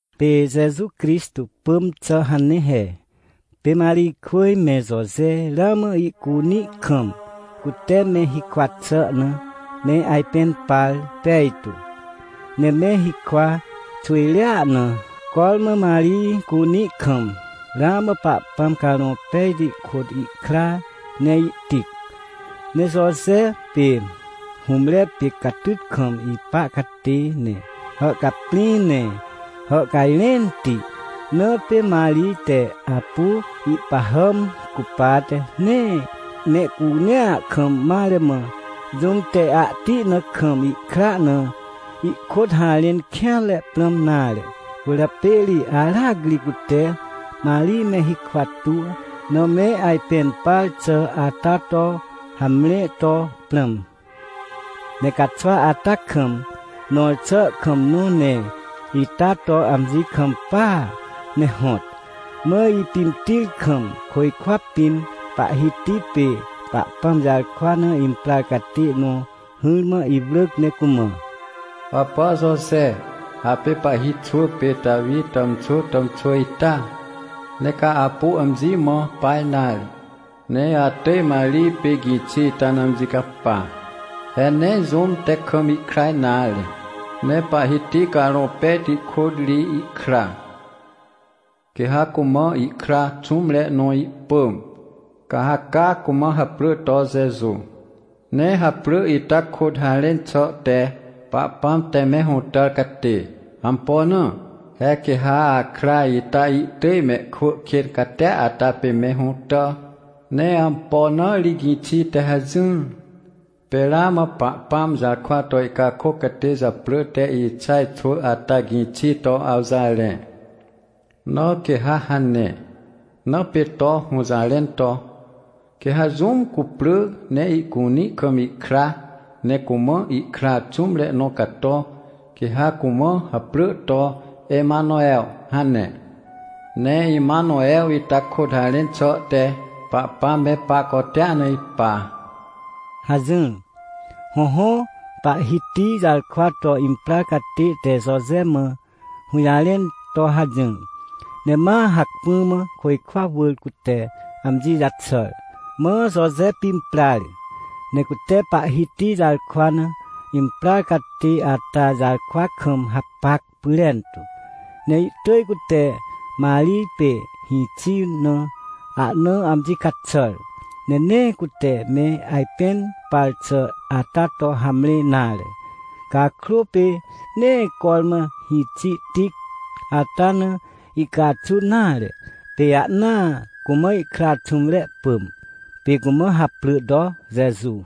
Pê Jeju Crixtô pỳm xà hane he. Pê Marijkwỳj me Joje ramã ihcunĩ kam, cute me hikwa xà na, me ajpẽn par pejtu. Ne me hikwa xwỳjrea na, cormã Marij cunĩ kam, ramã Pahpãm Carõ Pejti kôt ihkra ne ihtic. Ne Joje pê hũmre pê catyt kam ipa catê, ne hàhcaprĩ, ne hàhcajrẽnti, na pê Marij te apu ihpahàm cupate, nee mehcunea kam mare mã, jũm te ahti na kam ihkra na ihkôt harẽn kêanre prãm nare. Cwỳrjapê ri aracri cute Marij me hikwa tuw na me ajpẽn par xà ata to hamre to prãm. Ne caxwa ata kam, nõr xà kam nõ ne ita to amji kampaa, ne hõt. Mã ipimtir kam, côjkwa pĩn Pahhiti pê Pahpãm jarkwa na imprar catê nõ hỹrmã iwrỳc ne cumã: — Hàpà Joje, apê pahhi xwỳ pê Tawi tàmxwỳ tàmxwỳ ita! Nee ca apu amji mã pa nare, ne atỳj Marij pê gĩxi ita na amji capa. He nee jũm te kam ihkra nare, ne Pahhiti Carõ Pejti kôt ri ihkra. Quê ha cumã ihkra xũmre nõ ihpỳm, ca ha caa cumã haprỳ to Jeju. Ne haprỳ ita kôt harẽn xà te “Pahpãm te me hũtàr catê”. Ampo na? He quê ha akra ita ihtỳj mehkwỳ kên catia ata pê me hũtà. Ne ampo na ri gĩxi te hajỹr? Pê ramã Pahpãm jarkwa to ihcakôc catê japrỳ te Ixaj xwỳ ata gĩxi to awjarẽ, na quê ha hane. Na pê to hũjarẽn to: “Quê ha jũm cuprỳ ne ihcunĩ kam ihkra, ne cumã ihkra xũmre nõ cato, quê ha cumã haprỳ to Emanew” hane. Ne Emanew ita kôt harẽn xà te “Pahpãm me pahcotea na ipa” — hajỹr. Hõhõ, Pahhiti jarkwa to imprar catê te Joje mã hũjarẽn to hajỹr, ne ma hacpỹ mã côjkwa wỳr cute amji jaxàr. Mã Joje pimprar, ne cute Pahhiti jarkwa na imprar catê ata jarkwa kam hapac pyrentu. Ne ihtỳj cute Marij pê hĩxi na ahna amji caxàr, ne nee cute me ajpẽn par xà ata to hamre nare. Cakrô, pê nee cormã hĩxi tic ata na ihcaxun nare, pê ahnaa cumã ihkra xũmre pỳm, pê cumã haprỳ to Jeju.